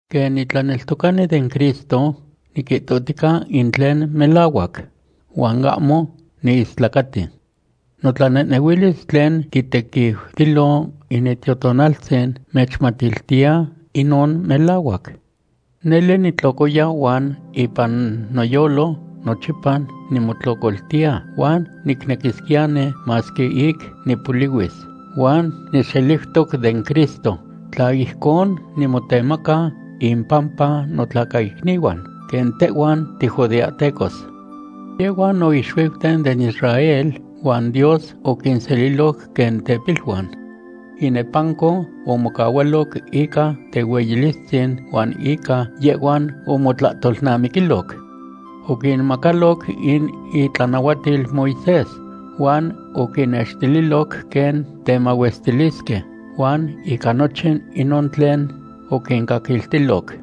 Quen nitlaneltocani den Cristo, niquihtohtica in tlen melahuac, huan ahmo niistlacati. Notlanehnehuilis tlen quitequiutilo in Itiotonaltzin nechmatiltiya inon melahuac. Nele nitlocoya huan ipan noyolo nochipa nimotlocoltiya, huan nicnequisquiyani masque ic nipolihuis, huan nixeliutoc den Cristo, tla ijcon nimotemaca impampa notlacaicnihuan, quen tehhuan tijudeahtecos. Yehhuan no ixuiuten den Israel huan Dios oquinseliloc quen tepiluan. Inepanco omocahualoc ica tehueyilistzin huan ica yehhuan omotlahtolnamiquiloc. Oquinmacaloc in itlanahuatil Moisés, huan oquinnextililoc quen temahuestilisque, huan ica nochin inon tlen oquincaquiltiloc.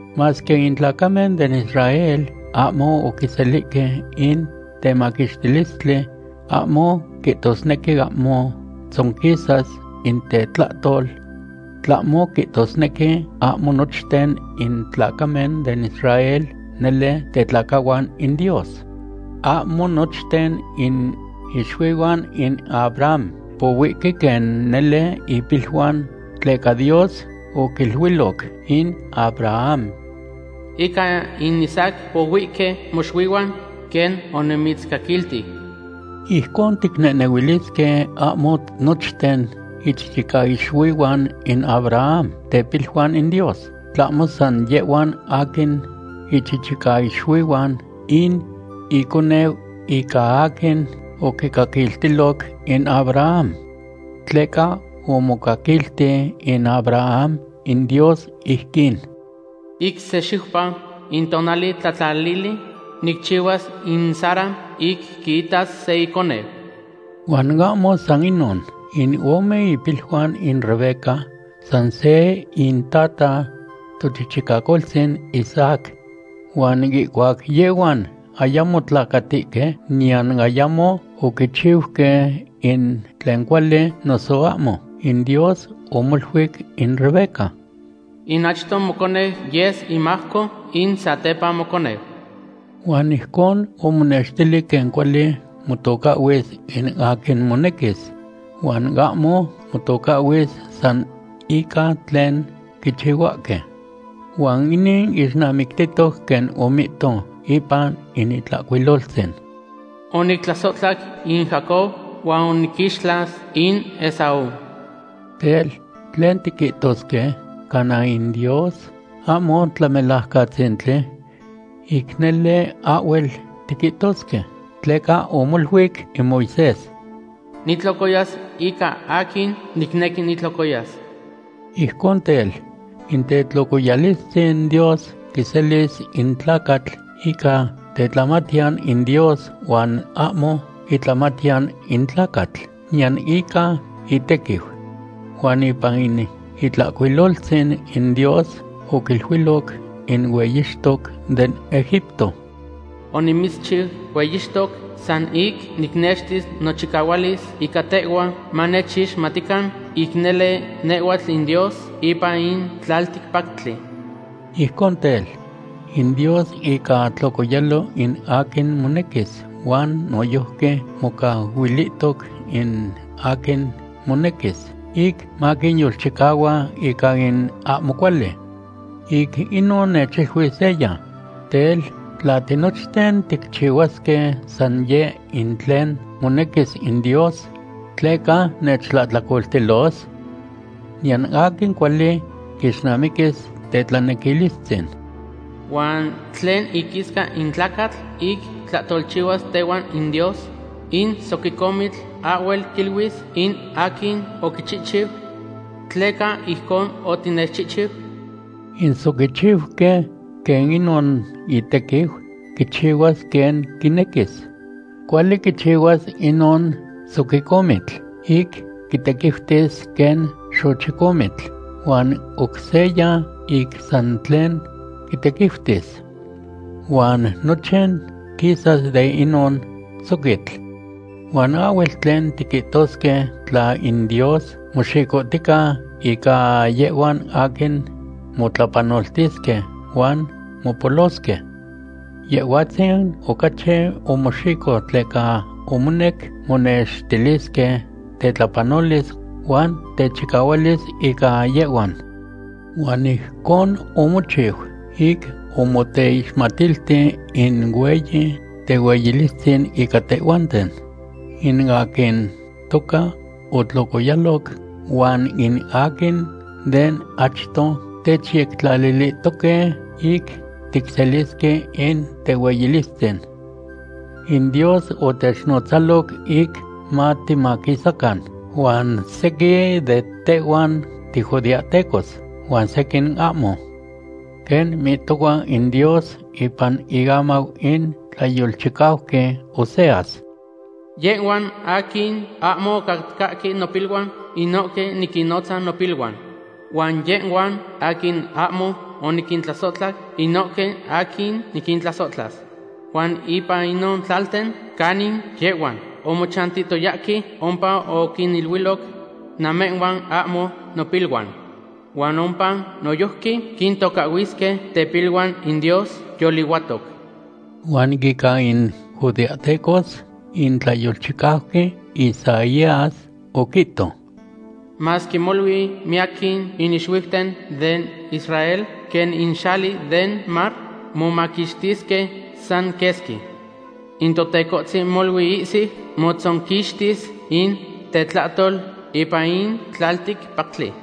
Masque in tlacamen den Israel ahmo oquiselihque in temaquixtilistli, ahmo quihtosnequi ahmo tzonquisas in tetlahtol. Tlahmo quihtosnequi ahmo nochten in tlacamen den Israel nele tetlacahuan in Dios. Ahmo nochten in ixuihuan in Abraham pohuihque quen nele ipiluan, tleca Dios oquiluiloc in Abraham: “Ica in Isaac pohuihque moxuihuan, quen onimitzcaquilti.” Ijcon ticnehnehuilisque ahmo nochten ichichicaixuihuan in Abraham tepiluan in Dios, tlahmo san yehhuan aquin ichichicaixuihuan in iconeu ica aquin oquicaquiltiloc in Abraham. Tleca omocaquilti in Abraham in Dios ijquin: “Ic se xiupa, in tonali tlatlalili, nicchicahuas in Sara ic quiitas se iconeu.” Huan ahmo san inon. In ome ipiluan in Rebeca san se intata, tochichicacoltzin Isaac. Huan ihcuac yehhuan ayamo tlacatihque, niyan ayamo oquichiuque in tlen cuali noso ahmo, in Dios omoluic in Rebeca: “In achto moconeu yes imajco in satepa moconeu.” Huan ijcon omonextili quen cuali motocahhuis in aquin monequis, huan ahmo motocahhuis san ica tlen quichihuahque. Huan inin ixnamictihtoc quen omihto ipan in Itlahcuiloltzin: “Onictlasohtla in Jacob huan oniquixtlas in Esaú.” Tel, ¿tlen tiquihtosque? ¿Cana in Dios ahmo Tlamelajcatzintli? ¡Ic nele ahhuel tiquihtosque! Tleca omoluic in Moisés: “Nitlocoyas ica aquin nicnequi nitlocoyas.” Ijcon tel, in tetlocoyalistzin Dios quiselis in tlacatl ica tetlamatiyan in Dios huan ahmo itlamatiyan in tlacatl, niyan ica itequiu. Huan ipan in Itlahcuiloltzin, in Dios oquiluiloc in hueyixtoc den Egipto: “Onimitzchiu hueyixtoc san ic nicnextis nochicahualis ica tehhua, manechixmatican ic nele nehhuatl in Dios ipan in tlalticpactli.” Ijcon tel, in Dios ica tlocoyalo in aquin monequis huan noyojqui mocahuilihtoc in aquin monequis ic maquiyolchicahua ica in ahmo cuali. Ic inon nechiluis seya: “Tel, ¿tla tinochten ticchihuasque san yeh in tlen monequis in Dios, tleca nechtlahtlacoltilos? Niyan aquin cuali quixnamiquis tetlanequilistzin.” ¿Huan tlen iquisca in tlacatl ic tlahtolchihuas tehuan in Dios? In soquicomitl ahhuel quiluis in aquin oquichihchiu: “¿Tleca ijcon otinechchihchiu?” In soquichiuqui, quen inon itequiu, quichihuas quen quinequis. Cuali quichihuas inon soquicomitl ic quitequiutis quen xochicomitl huan oc seya ic san tlen quitequiutis. Huan nochin quisas de inon soquitl. Huan ahhuel tlen tiquihtosque tla in Dios moxicohtica ica yehhuan aquin motlapanoltisque huan mopolosque. Yehhuatzin ocachi omoxico tleca omonec monextilisque tetlapanolis huan techicahualis ica yehhuan. Huan ijcon omochiu ic omoteixmatilti in hueyi tehueyilistzin ica tehhuanten, in aquin toca otlocoyaloc huan in aquin de achto techyectlalilihtoque ic ticselisque in tehueyilistzin. In Dios otechnotzaloc ic matimaquisacan, huan sequin de tehhuan tijudeahtecos, huan sequin ahmo. Quen mihtohua in Dios ipan iamau in tlayolchicauqui Oseas: Yehhuan aquin ahmo ocatcahque nopiluan, inohque niquinnotzas nopiluan. Huan yehhuan aquin ahmo oniquintlasohtla, inohque aquin niquintlasohtlas. Huan ipan inon tlalten canin yehhuan omochantihtoyahque, ompa oquiniluiloc: “Namehhuan ahmo nopiluan”, Huan ompa noyojqui quintocahhuisque tepiluan in Dios yolihuatoc. Huan ica in judeahtecos, in tlayolchicauqui Isaías oquihto: “Masque molui miyaquin in ixuiuten den Israel quen in xali den mar, momaquixtisque san quesqui. In Totecohtzin molui ihsiu motzonquixtis in tetlahtol ipan in tlalticpactli.”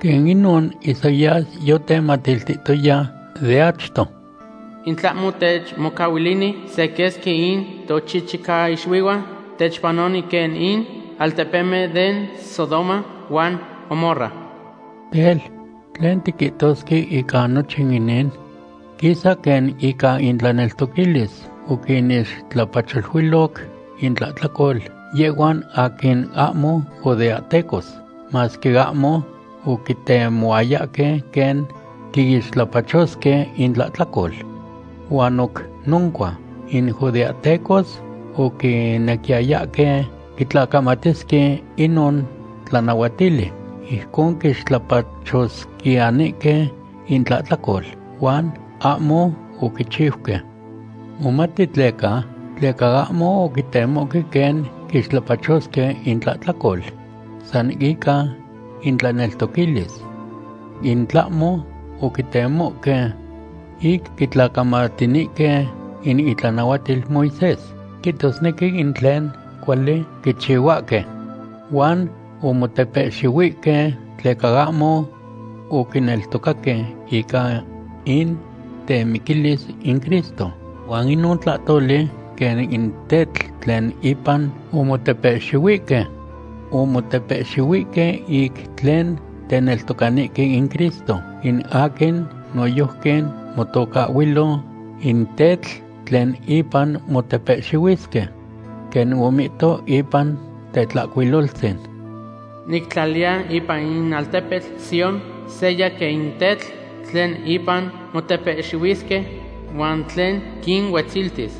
Quen inon Isaías yotematiltihtoya de achto: In tlahmo techmocahuilini se quesqui in tochichicaixuihuan, techpanoni quen in altepemen den Sodoma huan Gomorra. Tel, ¿tlen tiquihtosque ica nochin inin? Quisa quen ica intlaneltoquilis oquinixtlapacholuiloc intlahtlacol yehhuan aquin ahmo judeahtecos, masque ahmo oquitemohuayahque quen quiixtlapachosque intlahtlacol. Huan oc noncua, in judeahtecos oquinequiyayahque quitlacamatisque inon tlanahuatili, ijcon quixtlapachosquiyanihque intlahtlacol, huan ahmo oquichiuque. ¿Momati tleca? Tleca ahmo oquitemohque quen quixtlapachosque intlahtlacol san ica intlaneltoquilis, in tlahmo oquitemohque ic quitlacamatinihque in itlanahuatil Moisés, quihtosnequi in tlen cuali quichihuahque. Huan omotepehxihuihque tleca ahmo oquineltocaque ica in temiquilis in Cristo, huan inon tlahtoli quen in tetl tlen ipan omotepehxihuihque. Omotepehxihuihque ic tlen teneltocanihque in Cristo, in aquin noyojqui motocahhuilo in “tetl tlen ipan motepehxihuisque.” Quen omihto ipan Tetlahcuiloltzin: Nictlaliya ipan in tepetl Sión seya quen in tetl tlen ipan motepehxihuisque, huan tlen quinuetziltis.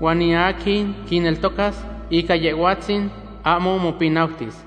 Huan in aquin quineltocas ica Yehhuatzin ahmo mopinautis.